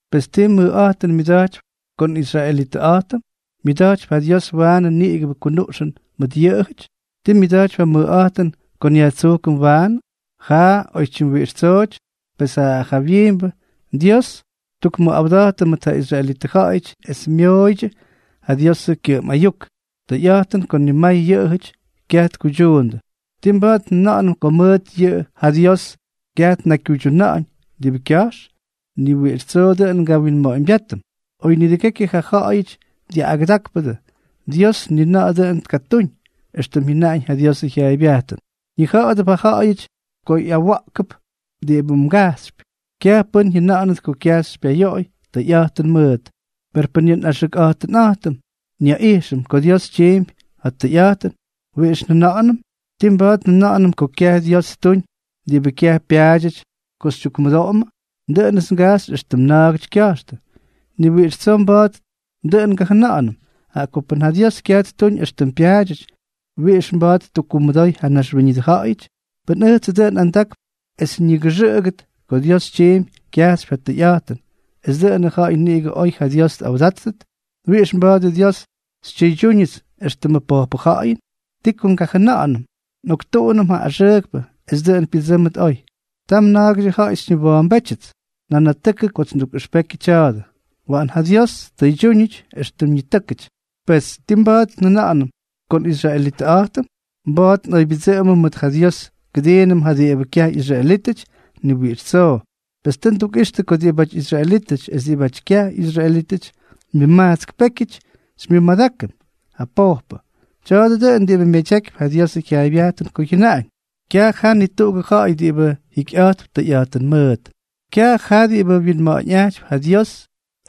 Pes, ¿ti mʉjꞌa̱jtʉn myʉda̱jtypy ko nꞌisraelitʉꞌa̱jtʉm? ¿Myʉda̱jtypy ja Dios waanʉ niꞌigʉbʉ kunuꞌxʉn mʉt yʉꞌʉjʉty? ¿Tii myʉda̱jtypy ja mʉjꞌa̱jtʉn ko nyajtsujkʉm waanʉ? Jaꞌa. Oytyim wiꞌix tsooty. Pes ja jawyiimbʉ, Dios tyukmʉꞌawda̱jtʉ mʉt ja israelitʉ ja̱ꞌa̱yʉty es myooydyʉ ja Diosʉ kyʉꞌʉm ayuk. Tʉyꞌa̱jtʉn ko nimay yʉꞌʉjʉty kyaj tkuydyuundʉ. ¿Tii mba̱a̱t njʉna̱ꞌa̱nʉm ko mʉt yʉꞌʉ ja Dios kyaj tnakykyuydyuna̱ꞌa̱ñ diꞌibʉ kya̱jx? ¡Ni wiꞌix tsoo dʉꞌʉn ngawinma̱ꞌa̱ñbyátʉm! Oy nidʉgekyʉ ja ja̱ꞌa̱yʉty jyaꞌꞌandákpʉdʉ, Dios ni na̱ꞌa̱ dʉꞌʉn tkatúñ. Extʉm jyʉnaꞌañ ja Diosʉ jyaaybyajtʉn: Ñija̱ꞌa̱dʉp ja ja̱ꞌa̱yʉty ko ꞌyawa̱ꞌkʉp diꞌibʉ mgajxypy, kyaj pʉ́n jyʉna̱ꞌa̱nʉt ko kyaj xypyayoꞌoy tʉyꞌa̱jtʉn mʉʉt. Per pʉn yʉ nꞌaxʉkꞌa̱jtʉnꞌa̱jtʉm nyaꞌijxʉm ko Dios tyiimpy ja tʉyꞌa̱jtʉn, ¿wiꞌix njʉna̱ꞌa̱nʉm? ¿Tii mba̱a̱t njʉna̱ꞌa̱nʉm ko kyaj Dios ttuñ diꞌibʉ kyaj pyaadyʉty ko xytyukkumʉdoꞌomʉ? (Dʉꞌʉnʉts ngajxy éxtʉm na̱a̱gʉty kya̱jxtʉ.) Ni wiꞌix tsoo mba̱a̱t dʉꞌʉn ngajʉna̱ꞌa̱nʉm. Jaꞌa ko pʉn ja Dios kyaj ttuñ éxtʉm pyaadyʉty, ¿wiꞌix mba̱a̱t ttukkumʉdoy ja naxwíñʉdʉ ja̱ꞌa̱yʉty? Pʉn ʉjtsʉ dʉꞌʉn andakp es ñigʉxʉꞌʉgʉt ko Dios tyiimpy kyajxypy ja tʉyꞌa̱jtʉn esʉ dʉꞌʉnʉ ja̱ꞌa̱y niꞌigʉ oy ja Dios tꞌawdáttʉt, ¿wiꞌix mba̱a̱dʉ Dios xytyʉydyúñʉts éxtʉmʉ pojpʉ ja̱ꞌa̱yʉn? ¿Ti ko ngajʉna̱ꞌa̱nʉm?: “Nꞌoktuꞌunʉm ja axʉʉkpʉ es dʉꞌʉn pyʉdsʉ́mʉt oy.” Tam na̱a̱gʉdyʉ ja̱ꞌa̱y xyñiwa̱a̱mbétyʉts nanatʉkʉ kots ndukꞌʉxpekyʉ tya̱a̱dʉ. ¡Waꞌan ja Dios ttʉydyúñʉty éxtʉm ñitʉ́kʉty! Pes, ¿ti mba̱a̱t njʉna̱ꞌa̱nʉm ko nꞌisraelitʉꞌa̱jtʉm? ¿Mba̱a̱t nꞌoybyʉdsʉꞌʉmʉm mʉt ja Dios kʉdiinʉm ja diꞌibʉ kyaj ꞌyisraelítʉty? ¡Ni wiꞌix tsoo! Pes tʉ ndukꞌixtʉ ko diꞌibáty israelítʉty es diꞌibáty kyaj ꞌyisraelítʉty, nimajtsk pékyʉty xymyʉmadákʉm ja pojpʉ. Tya̱a̱dʉ dʉꞌʉn diꞌibʉ myadyakypy ja Diosʉ jyaaybyajtʉn ko jyʉnaꞌañ: Kyaj jaa ni tuꞌugʉ ja̱ꞌa̱y diꞌibʉ jikyꞌa̱jtp tʉyꞌa̱jtʉn mʉʉt, kyaj jaa diꞌibʉ wyinma̱ꞌa̱ñꞌajtypy ja Dios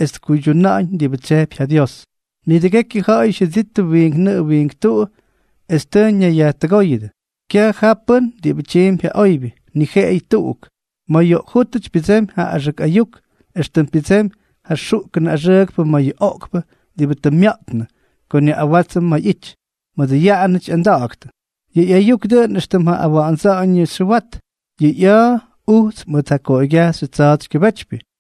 es tkuydyuna̱ꞌa̱ñ diꞌibʉ tsyejpy ja Dios. Nidʉgekyʉ ja̱ꞌa̱yʉty jyʉdittʉ wiink nʉꞌʉ wiink tuꞌu es tʉ ñayyajtʉgóyʉdʉ. Kyaj jaa pʉ́n diꞌibʉ tyiimpy ja oybyʉ, ni jeꞌeyʉ tuꞌuk. Ma̱ yoꞌkjútʉty pyʉdsemy ja axʉk ayuk, éxtʉm pyʉdsemy ja xuꞌkʉnʉ axʉʉkpʉ ma̱ yʉ oꞌkpʉ diꞌibʉ tʉ mya̱ꞌtnʉ ko nyaꞌꞌawátsʉm ma̱ ꞌyity, mʉdʉ yaꞌanʉty ꞌyanda̱ꞌa̱ktʉ. Yʉ ꞌyayuk dʉꞌʉn éxtʉm ja awa̱ꞌa̱ndsa̱ꞌa̱ñʉ xyʉwat. Yʉ ꞌya̱a̱ ujts mʉt ja koꞌoygyajxy tsa̱a̱tsykyʉbétypyʉ.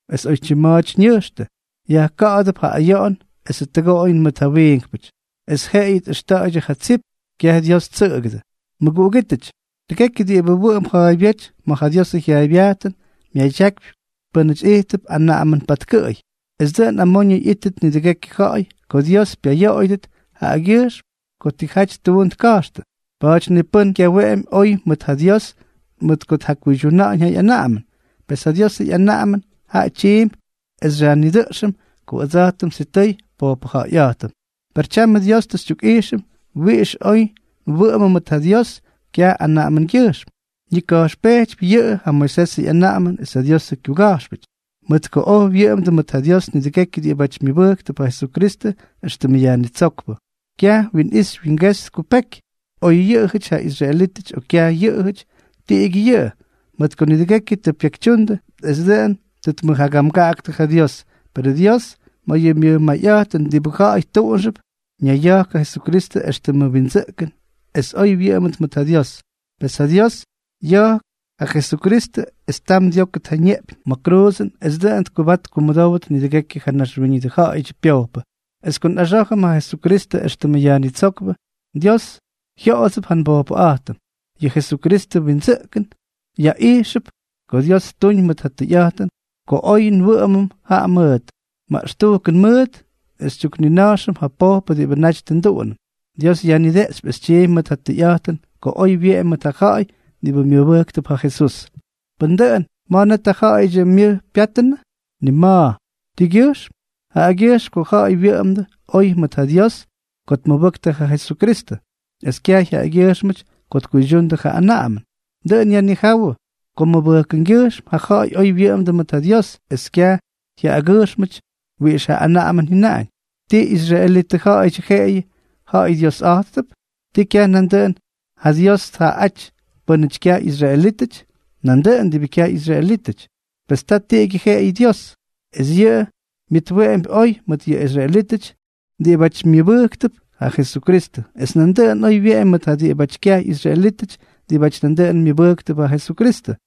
es oytyim ma̱a̱ty ñʉjxtʉ, yajka̱ꞌa̱dʉp ja ayoꞌon esʉ tʉgoꞌoyʉn mʉt ja wiinkpʉty, es jeꞌeyʉ tꞌʉxta̱ꞌa̱ydyʉ ja tsip. Kyaj Dios ttsʉꞌʉgʉdʉ. Mʉguꞌugítʉty, tʉgekyʉ diꞌibʉ wʉꞌʉmp ja̱a̱ybyéty ma̱ ja Diosʉ jyaaybyajtʉn, myadyakypy pʉ́nʉty ijttʉp anaꞌamʉn patkʉꞌʉy, es dʉꞌʉn amoñʉ ꞌyíttʉt nidʉgekyʉ ja̱ꞌa̱y ko Dios pyayoꞌoyʉdʉt jaꞌagyʉjxm ko tijaty ttuun tka̱jxtʉ. Pa̱a̱ty ni pʉ́n kyaweꞌemy oy mʉt ja Dios mʉt ko tjakuydyuna̱ꞌa̱ñ ja ꞌyanaꞌamʉn. Pes ja Diosʉ ꞌyanaꞌamʉn jaꞌa tyiimpy es xyajnidʉꞌxʉm ko ʉdsa̱jtʉm sitʉy pojpʉja̱ꞌa̱yꞌa̱jtʉm. Per tyamʉ Dios tʉ xytyukꞌijxʉm wiꞌix oy nwʉꞌʉmʉm mʉt ja Dios kyaj anaꞌamʉngyʉjxm. Ñika̱jxpejtypy yʉꞌʉ ja Moisesʉ ꞌyanaꞌamʉn es ja Diosʉ kyuga̱jxpʉty, mʉt ko oy wyʉꞌʉmdʉ mʉt ja Dios nidʉgekyʉ diꞌibáty myʉbʉjktʉp ja Jesukristʉ éxtʉmʉ Yajnitsókpʉ. Kyaj winꞌixy wingexy tkupeky. Oy yʉꞌʉjʉty ja israelítʉty o kyaj yʉꞌʉjʉty, tiꞌigyʉ yʉꞌʉ, mʉt ko nidʉgekyʉ tʉ pyekytyundʉ es dʉꞌʉn tʉ tmʉjagamgaꞌaktʉ ja Dios. Perʉ Dios, ma̱ yʉ myʉj mayꞌa̱jtʉn diꞌibʉ ja̱ꞌa̱y tuꞌunxʉp, ñaya̱jk ja Jesukristʉ éxtʉmʉ windsʉꞌkʉn es oy nwʉꞌʉmʉm mʉt ja Dios. Pes ja Dios ya̱jk ja Jesukristʉ es ttam dyókʉt ja ñeꞌpyñ ma̱ ja kruuzʉn es dʉꞌʉn tkʉbat tkumʉdówʉt nidʉgekyʉ ja naxwíñʉdʉ ja̱ꞌa̱yʉdyʉ pyojpʉ. Es ko nꞌaxá̱jʉm ja Jesukristʉ éxtʉmʉ Yajnitsókpʉ, Dios jyoꞌodsʉp ja nbojpʉꞌa̱jtʉm. Yʉ Jesukristʉ wyindsʉꞌkʉn yaꞌijxʉp ko Dios ttuñ mʉt ja tʉyꞌa̱jtʉn ko oy nwʉꞌʉmʉm jaꞌa mʉʉt. Maꞌxtujkʉn mʉʉt xytyuknina̱jxʉm ja pojpʉ diꞌibʉ naty tʉ nduꞌunʉm. Dios yajnideꞌxypy es tyiimpy mʉt ja tʉyꞌa̱jtʉn ko oy wyeꞌemy mʉt ja ja̱ꞌa̱y diꞌibʉ myʉbʉjktʉp ja Jesús. Pʉn dʉꞌʉn, ¿ma̱ net ja ja̱ꞌa̱yʉdyʉ myʉj pyáttʉnʉ? ¡Ni ma̱! ¿Tigyʉjxm? Jaꞌagyʉjxm ko ja̱ꞌa̱y wyʉꞌʉmdʉ oy mʉt ja Dios ko tmʉbʉktʉ ja Jesukristʉ, es kyaj jaꞌagyʉjxm ko tkuydyundʉ ja anaꞌamʉn. Dʉꞌʉn yajnijáwʉ ko mʉbʉjkʉngyʉjxm ja ja̱ꞌa̱y oy wyʉꞌʉmdʉ mʉt ja Dios es kyaj jyaꞌagyʉjxmʉty wiꞌix ja anaꞌamʉn jyʉnaꞌañ. ¿Ti israelitʉ ja̱ꞌa̱yʉdyʉ jeꞌeyʉ ja Dios ja̱ꞌa̱yꞌa̱jtʉp? ¿Ti kyaj nandʉꞌʉn ja Dios tja̱ꞌa̱yꞌáty pʉ́nʉty kyaj ꞌyisraelítʉty? Nandʉꞌʉn diꞌibʉ kyaj ꞌyisraelítʉty. Pes ta tiꞌigyʉ jeꞌeyʉ Dios, es yʉꞌʉ myʉtweꞌempy oy mʉt yʉ israelítʉty diꞌibáty myʉbʉjktʉp ja Jesukristʉ, es nandʉꞌʉn oy wyeꞌemy mʉt ja diꞌibáty kyaj ꞌyisraelítʉty diꞌibáty nandʉꞌʉn myʉbʉjktʉp ja Jesukristʉ.